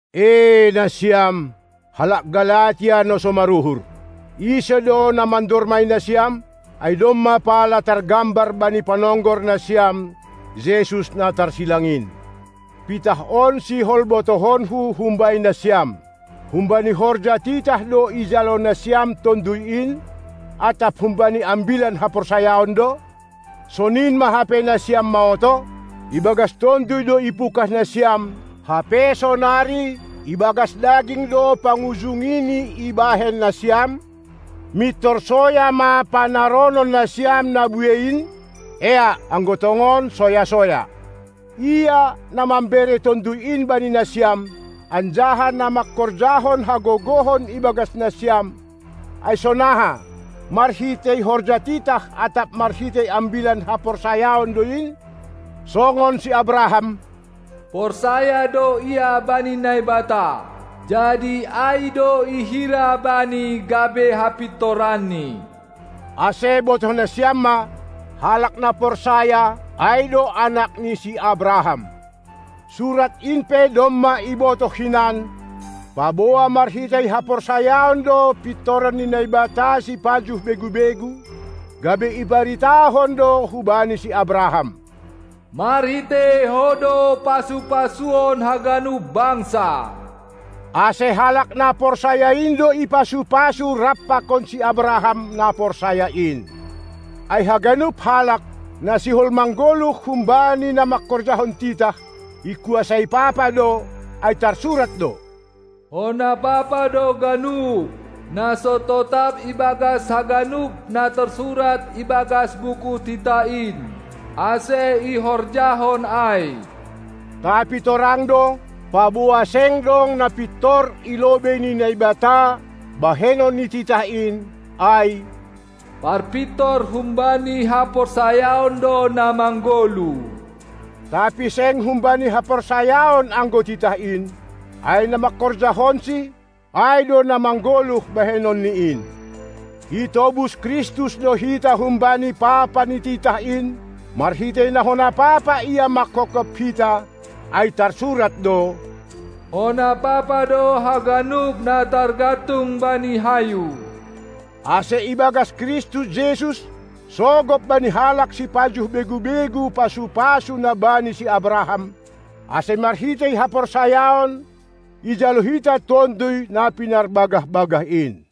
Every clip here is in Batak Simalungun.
E nasiam, halak Galatia na so maruhur! Ise do na mandormai nasiam? Ai domma pala targambar bani panonggor nasiam Jesus na tarsilang in. Pitah on sihol botohonku humbani nasiam: Humbani horja titah do ijalo nasiam Tonduy in, atap humbani Ambilan haporsayaon do? Sonin ma hape nasiam maoto? Ibagas Tonduy do ipungkah nasiam; hape sonari ibagas daging do pangujungini ibahen nasiam? Mintor soya ma panaronon nasiam na buei in? Eak, anggo tongon soya-soya. Ia, na mambere Tonduy in bani nasiam, anjaha na mangkorjahon hagogohon ibagas nasiam, ai sonaha, marhitei horja titah atap marhitei Ambilan haporsayaon do in? Songon si Abraham: Porsaya do ia bani Naibata, jadi ai do ihira bani gabe hapintoranni. Ase botoh nasiam ma, halak na porsaya, ai do anak ni si Abraham. Surat in pe domma ibotoh hinan, paboa marhitei haporsayaon do pintoran ni Naibata sipajuh begu-begu, gabe ibaritahon do hubani si Abraham: Marhitei ho do pasu-pasuon haganup bangsa. Ase, halak na porsaya in do ipasu-pasu rap pakon si Abraham na porsaya in. Ai haganup halak, na sihol manggoluh humbani na mangkorjahon titah, ikuasai papa do, ai tarsurat do: Hona papa do ganup, na so totap ibagas haganup na tarsurat ibagas buku titah in, ase ihorjahon ai. Tapi torang do, paboa seng adong na pintor i lobei ni Naibata bahenon ni titah in, ai "Parpintor humbani haporsayaon do na manggoluh". Tapi seng humbani haporsayaon anggo titah in, ai na mangkorjahonsi, ai do na manggoluh bahenonni in. Itobus Kristus do hita humbani papa ni titah in, marhitei na hona papa Ia manghophop hita, ai tarsurat do: Hona papa do haganup na targantung bani hayu, ase ibagas Kristus Jesus sogop bani halak sipajuh begu-begu pasu-pasu na bani si Abraham, ase marhitei haporsayaon ijalo hita Tonduy na pinarbagah-bagah in.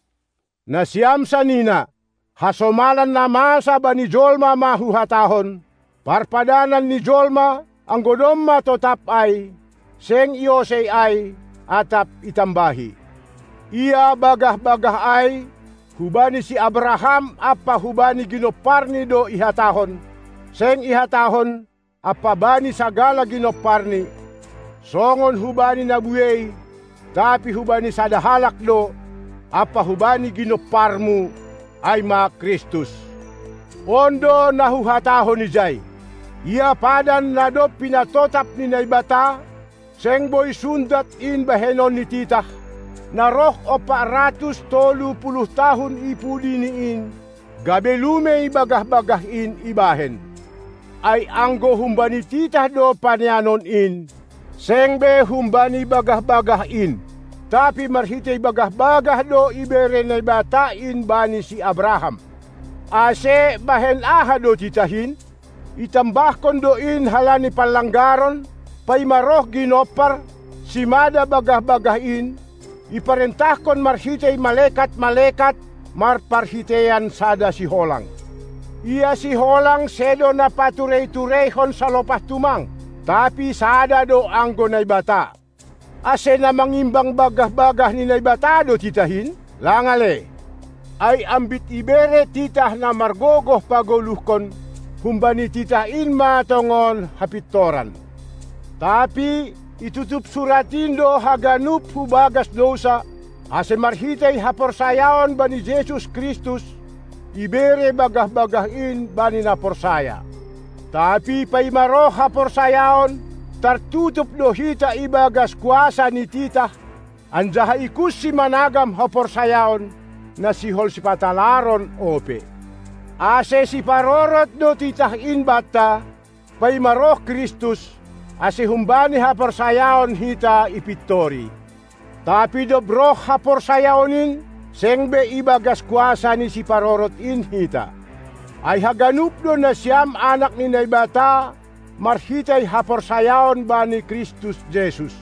Nasiam sanina, hasomalan na masa bani jolma ma huhatahon: Parpadanan ni jolma, anggo domma totap ai, seng iosei ai, atap itambahi. Ia bagah-bagah ai, hubani si Abraham ampa hubani ginomparni do ihatahon. Seng ihatahon: "Ampa bani sagala ginomparni", songon hubani na buei, tapi hubani sada halak do: "Ampa hubani ginomparmu", ai ma Kristus. On do na huhatahon ijai: Ia padan, na dob pinatotap ni Naibata, seng boi sundat in bahenon ni titah, na roh ompat ratus tolu puluh tahun i pudini in, gabe lumei bagah-bagah in ibahen. Ai anggo humbani titah do paneanon in, seng be humbani bagah-bagah in; tapi marhitei bagah-bagah do ibere Naibata in bani si Abraham. Ase bahen aha do titah in? Itambahkon do in halani panlanggaron, paima roh Ginompar, simada bagah-bagah in, iparentahkon marhitei malekat-malekat marparhiteian sada siholang. Ia siholang sedo na paturei-tureihon salopah tumang, tapi sada do anggo Naibata. Ase na mangimbang bagah-bagah ni Naibata do titah in? Lang ale! Ai ambit ibere titah na margogoh pagoluhkon, humbani titah in ma tongon hapintoran. Tapi itutup Surat in do haganup hubagas dousa, ase marhitei haporsayaon bani Jesus Kristus ibere bagah-bagah in bani na porsaya. Tapi paima roh haporsayaon, tartutup do hita ibagas kuasa ni titah, anjaha ikunsi managam haporsayaon, na sihol sipatalaron ope. Ase siparorot do titah in banta, paima roh Kristus, ase humbani haporsayaon hita ipintori. Tapi dob roh haporsayaon in, seng be ibagas kuasa ni siparorot in hita. Ai haganup do nasiam anak ni Naibata marhitei haporsayaon bani Kristus Jesus.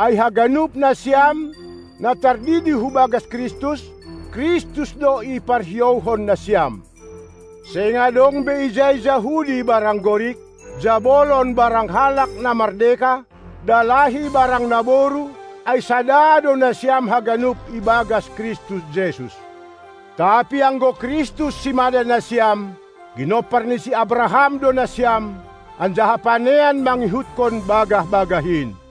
Ai haganup nasiam, na tardidi hubagas Kristus, Kristus do iparhiouhon nasiam. Seng dong be ijai Jahudi barang Gorik, jabolon barang halak na mardeka, dalahi barang naboru, ai sada do nasiam haganup ibagas Kristus Jesus. Tapi anggo Kristus simada nasiam, ginompar ni si Abraham do nasiam, anjaha panean mangihutkon bagah-bagah in.